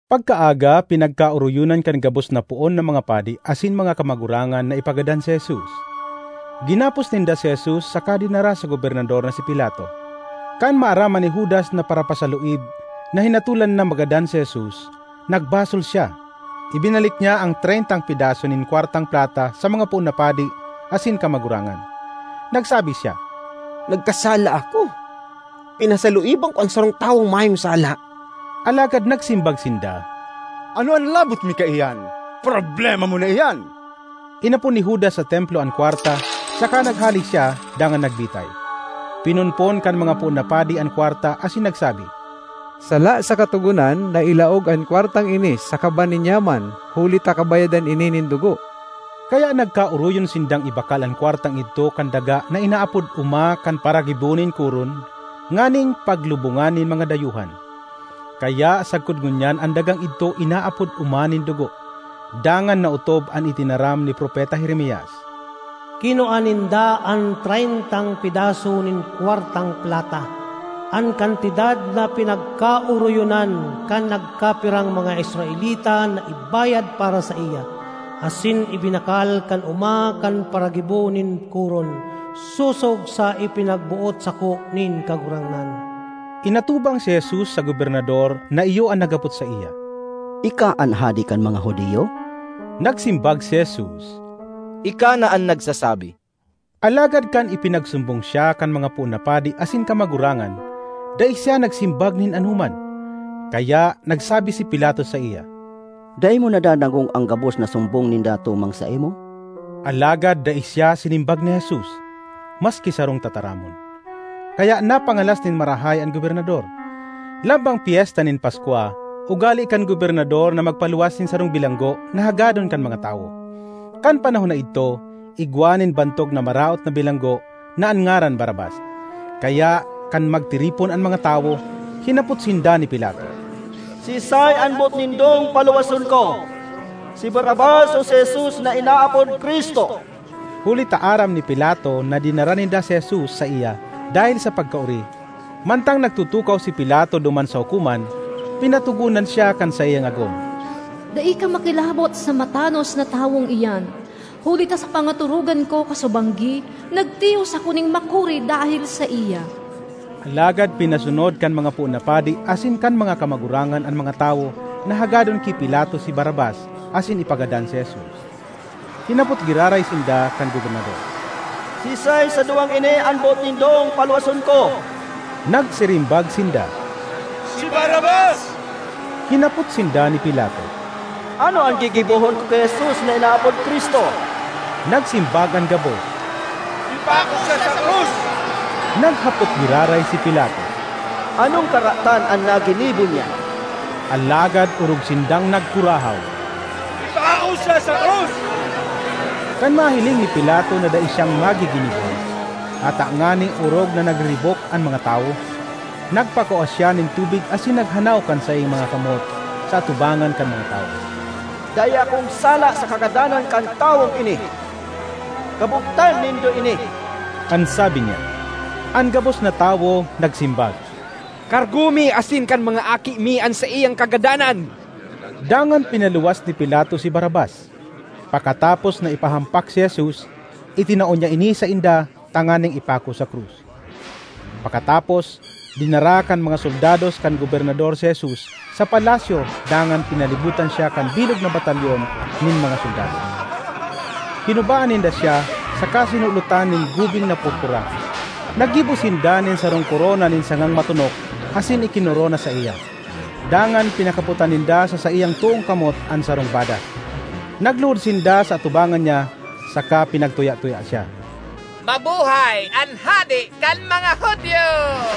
Pagkaaga, pinagkaoroyonan kan gabos na poon na mga padi asin mga kamagurangan na ipagadan si Jesus. Ginapos ninda si Jesus saka dinara sa gobernador na si Pilato. Kan maaraman ni Judas na parapasaluib, na hinatolan na magadan si Jesus, nagbasol siya; ibinalik niya an treyntang pedaso nin kwartang plata sa mga poon na padi asin kamagurangan. Nagsabi siya, “Nagkasala ako! Pinasaluiban ko an sarong tawong mayong sala!” Alagad nagsimbag sinda, “Ano an labot mi kaiyan? Problema mo na iyan!” Inapon ni Judas sa Templo an kwarta saka naghale siya dangan nagbitay. Pinonpon kan mga poon na padi an kwarta asin nagsabi, “Sala sa Katogonan na ilaog an kwartang ini sa kaban nin yaman huli ta kabayadan ini nin dugo.” Kaya nagkaoroyon sindang ibakal an kwartang idto kan daga na inaapod Oma kan Paragibo nin Koron nganing paglubongan nin mga dayuhan. Kaya sagkod ngunyan an dagang idto inaapod “Oma nin Dugo.” Dangan naotob an itinaram ni Propeta Jeremias, “Kinua ninda an treyntang pedaso nin kwartang plata, an kantidad na pinagkaoroyonan kan nagkapirang mga Israelita na ibayad para saiya, asin ibinakal kan oma kan paragibo nin koron, sosog sa ipinagboot sako nin Kagurangnan.” Inatubang si Jesus sa gobernador na iyo an naghapot saiya, “Ika an hade kan mga Judio?” Nagsimbag si Jesus, “Ika na an nagsasabi.” Alagad kan ipinagsumbong siya kan mga poon na padi asin kamagurangan, dai siya nagsimbag nin anoman. Kaya nagsabi si Pilato saiya, “Dai mo nadadangog an gabos na sumbong ninda tumang saimo?” Alagad dai siya sinimbag ni Jesus, maski sarong tataramon; kaya napangalas nin marahay an gobernador. Lambang Pyesta nin Paskwa, ugale kan gobernador na magpaluwas nin sarong bilanggo na hagadon kan mga tawo. Kan panahon na idto igwa nin bantog na maraot na bilanggo na an ngaran Barrabas. Kaya kan magtiripon an mga tawo, hinapot sinda ni Pilato, “Siisay an boot nindong paluwason ko, si Barrabas o si Jesus na inaapod Cristo?” Huli ta aram ni Pilato na dinara ninda si Jesus saiya dahel sa pagkaori. Mantang nagtutukaw si Pilato duman sa hukoman, pinatogonan siya kan saiyang agom: “Dai ka makilabot sa matanos na tawong iyan, huli ta sa pangatorogan ko kasubanggi, nagtios ako nin makuri dahel saiya.” Alagad pinasunod kan mga poon na padi asin kan kamagurangan an mga tawo na hagadon ki Pilato si Barrabas asin ipagadan si Jesus. Hinapot giraray sinda kan gobernador, “Siisay sa duwang ini an boot nindong paluwason ko?” Nagsirimbag sinda, “Si Barrabas!” Hinapot sinda ni Pilato, “Ano an gigibohon ko ki Jesus na inaapod Cristo?” Nagsimbag an gabos, “Ipako siya sa krus!” Naghapot giraray si Pilato, “Anong karatan an naginibo niya?” Alagad orog sindang nagkurahaw, “Ipako siya sa krus!” Kan mahiling ni Pilato na dai siyang magiginibo, ata ngani orog na nagriribok an mga tawo, nagpakua siya nin tubig asin naghanaw kan saiyang mga kamot sa atubangan kan mga tawo. “Dai akong sala sa kagadanan kan tawong ini. Kabotan nindo ini!” an sabi niya. An gabos na tawo nagsimbag, “Kargo mi asin kan mga aki mi an saiyang kagadanan!” Dangan pinaluwas ni Pilato si Barrabas; pakatapos na ipahampak si Jesus, itinao niya ini sainda tanganing ipako sa krus. Pakatapos, dinara kan mga soldados kan gobernador si Jesus sa palasyo dangan pinalibotan siya kan bilog na batalyon nin mga soldados. Hinubaan ninda siya saka sinulotan nin gubing na purpura. Naggibo sinda nin sarong korona nin sangang matonok asin ikinorona saiya; dangan pinakapotan ninda sa saiyang toong kamot an sarong badas; nagluhod sinda sa atubangan niya saka pinagtuya-tuya siya, “Mabuhay an Hade kan mga Judio!”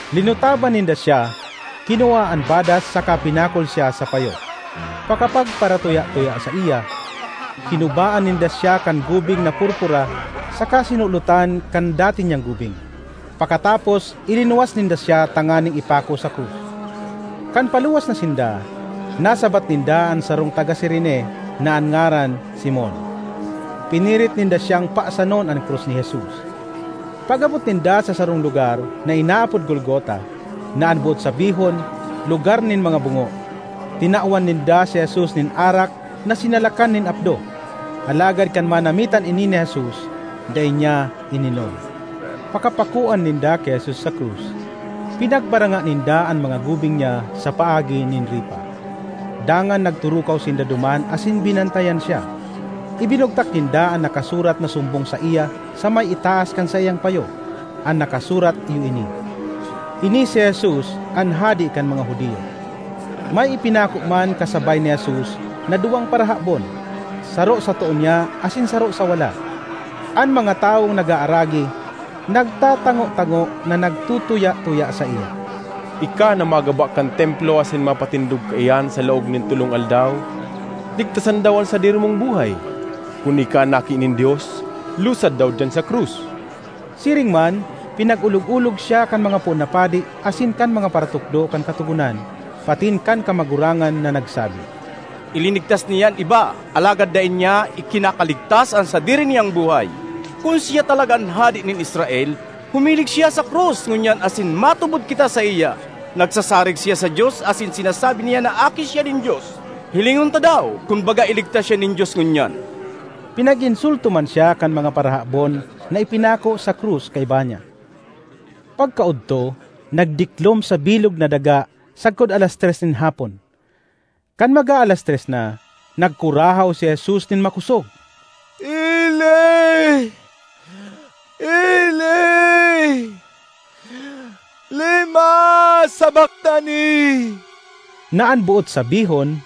Linutaban ninda siya, kinua an badas saka pinakol siya sa payo. Pakapagparatuya-tuya saiya, hinubaan ninda siya kan gubing na purpura saka sinulotan kan dati niyang gubing. Pakatapos, ilinuwas ninda siya tanganing ipako sa krus. Kan paluwas na sinda, nasabat ninda an sarong taga Cirene na an ngaran Simon; pinirit ninda siyang pasanon an krus ni Jesus. Pag-abot ninda sa sarong lugar na inaapod Golgota, na an boot sabihon, “Lugar nin mga Bungo,” tinawan ninda si Jesus nin arak na sinalakan nin apdo; alagad kan manamitan ini ni Jesus, dai niya ininom. Pakapakoan ninda ki Jesus sa krus, pinagbaranga ninda an mga gubing niya sa paagi nin ripa. Dangan nagturukaw sinda duman asin binantayan siya. Ibinugtak ninda an nakasurat na sumbong saiya sa may itaas kan saiyang payo. An nakasurat iyo ini: “Ini si Jesus, an Hade kan mga Judio.” May ipinako man kasabay ni Jesus na duwang parahabon, saro sa too niya asin saro sa wala. An mga tawong nag-aaragi nagtatango-tango na nagtutuya-tuya saiya, ”Ika na magaba kan Templo asin mapatindog kaiyan sa laog nin tolong aldaw, ligtasan daw an sadiri mong buhay! Kun ika an Aki nin Dios, lusad daw diyan sa krus!” Siring man, pinag-olog-olog siya kan mga poon na padi asin kan mga paratukdo kan Katogonan patin kan kamagurangan na nagsabi, ”Ilinigtas niya an iba alagad dai niya ikinakaligtas an sadiri niyang buhay! Kun siya talaga an Hade nin Israel, humilig siya sa krus ngunyan asin matubod kita saiya! Nagsasarig siya sa Dios asin sinasabi niya na Aki siya nin Dios; hilingon ta daw kun baga iligtas siya nin Dios ngunyan!” Pinag-insulto man siya kan mga parahabon na ipinako sa krus kaiba niya. Pagkaodto, nagdiklom sa bilog na daga sagkod alas tres nin hapon. Kan mag-aalas tres na, nagkurahaw si Jesus nin makosog, “Eli, Eli, lema sabactani?” na an boot sabihon,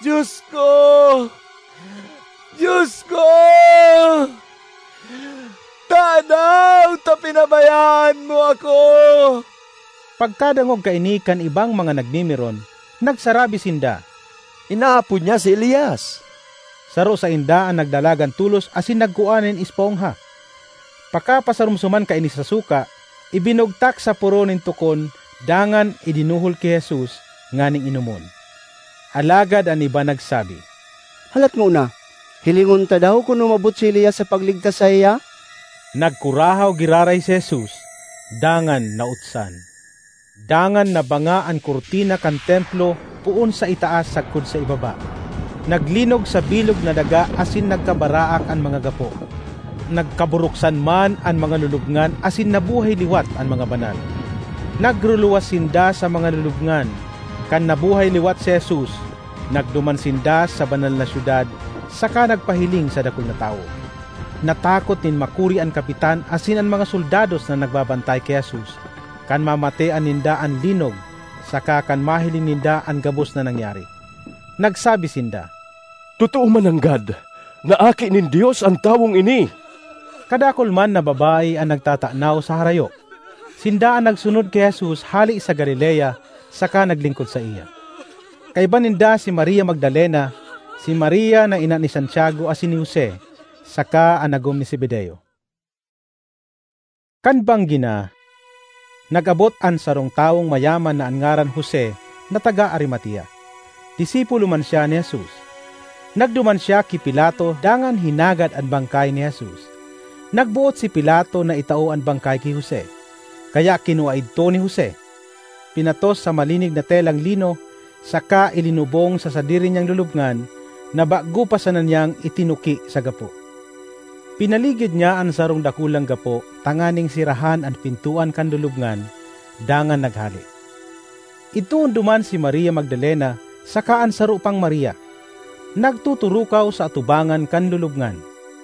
“Dios ko, Dios ko, tadaw ta pinabayaan mo ako?” Pagkadangog kaini kan ibang mga nagmimiron, nagsarabi sinda, “Inaapod niya si Elias!” Saro sainda an nagdalagan tolos asin nagkua nin espongha; pakapasaromsoman kaini sa suka, ibinugtak sa poro nin tukon dangan idinuhol ki Jesus nganing inomon. Alagad an iba nagsabi, “Halat ngona, hilingon ta daw kun umabot si Elias sa pagligtas saiya!” Nagkurahaw giraray si Jesus, dangan nautsan. Dangan nabanga an kurtina kan Templo poon sa itaas sagkod sa ibaba. Naglinog sa bilog na daga asin nagkabaraak an mga gapo. Nagkaburuksan man an mga lulubngan asin nabuhay liwat an mga banal. Nagruluwas sinda sa mga lulubngan. Kan nabuhay liwat si Jesus, nagduman sinda sa Banal na Syudad saka nagpahiling sa dakul na tawo. Natakot nin makuri an kapitan asin an mga soldados na nagbabantay ki Jesus kan mamatean ninda an linog saka kan mahiling ninda an gabos na nangyari. Nagsabi sinda, “Totoo mananggad na Aki nin Dios an tawong ini!” Kadakul man na babae an nagtatanaw sa harayo. Sinda an nagsunod ki Jesus hale sa Galilea saka naglingkod saiya. Kaiba ninda si Maria Magdalena, si Maria na ina ni Santiago asin ni Jose, saka an agom ni Zebedeo. Kan banggi na, nag-abot an sarong tawong mayaman na an ngaran Jose na taga Arimatea. Disipulo man siya ni Jesus. Nagduman siya ki Pilato dangan hinagad an bangkay ni Jesus. Nagboot si Pilato na itao an bangkay ki Jose. Kaya kinua idto ni Jose, pinatos sa malinig na telang lino, saka ilinubong sa sadiri niyang lulubngan na bago pa sana niyang itinuki sa gapo. Pinaligid niya an sarong dakulang gapo tanganing serahan an pintoan kan lulubngan dangan naghale. Idtoon duman si Maria Magdalena saka an sarong pang Maria, nagtuturukaw sa atubangan kan lulubngan.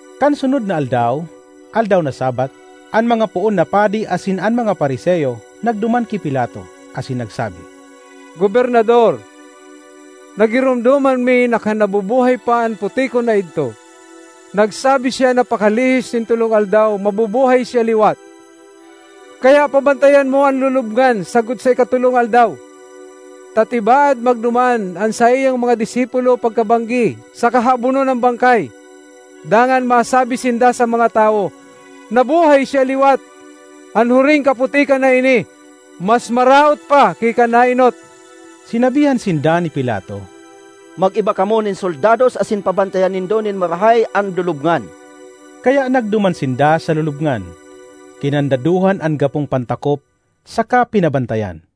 Kan sunod na aldaw aldaw na Sabbath, an mga poon na padi asin an mga Fariseo nagduman ki Pilato asin nagsabi, “Gobernador, nagiromdoman mi na kan nabubuhay pa an putikon na idto, nagsabi siya na pakalihis nin tolong aldaw mabubuhay siya liwat. Kaya pabantayan mo an lulubngan sagkod sa ikatolong aldaw, ta tibaad magduman an saiyang mga disipulo pagkabanggi saka habonon an bangkay; dangan masabi sinda sa mga tawo ‘Nabuhay siya liwat.’ An huring kaputikan na ini mas maraot pa ki kan naenot.” Sinabihan sinda ni Pilato, “Mag-iba kamo nin soldados asin pabantayan nindo nin marahay an lulubngan.” Kaya nagduman sinda sa lulubngan, kinandadohan an gapong pantakop saka pinabantayan.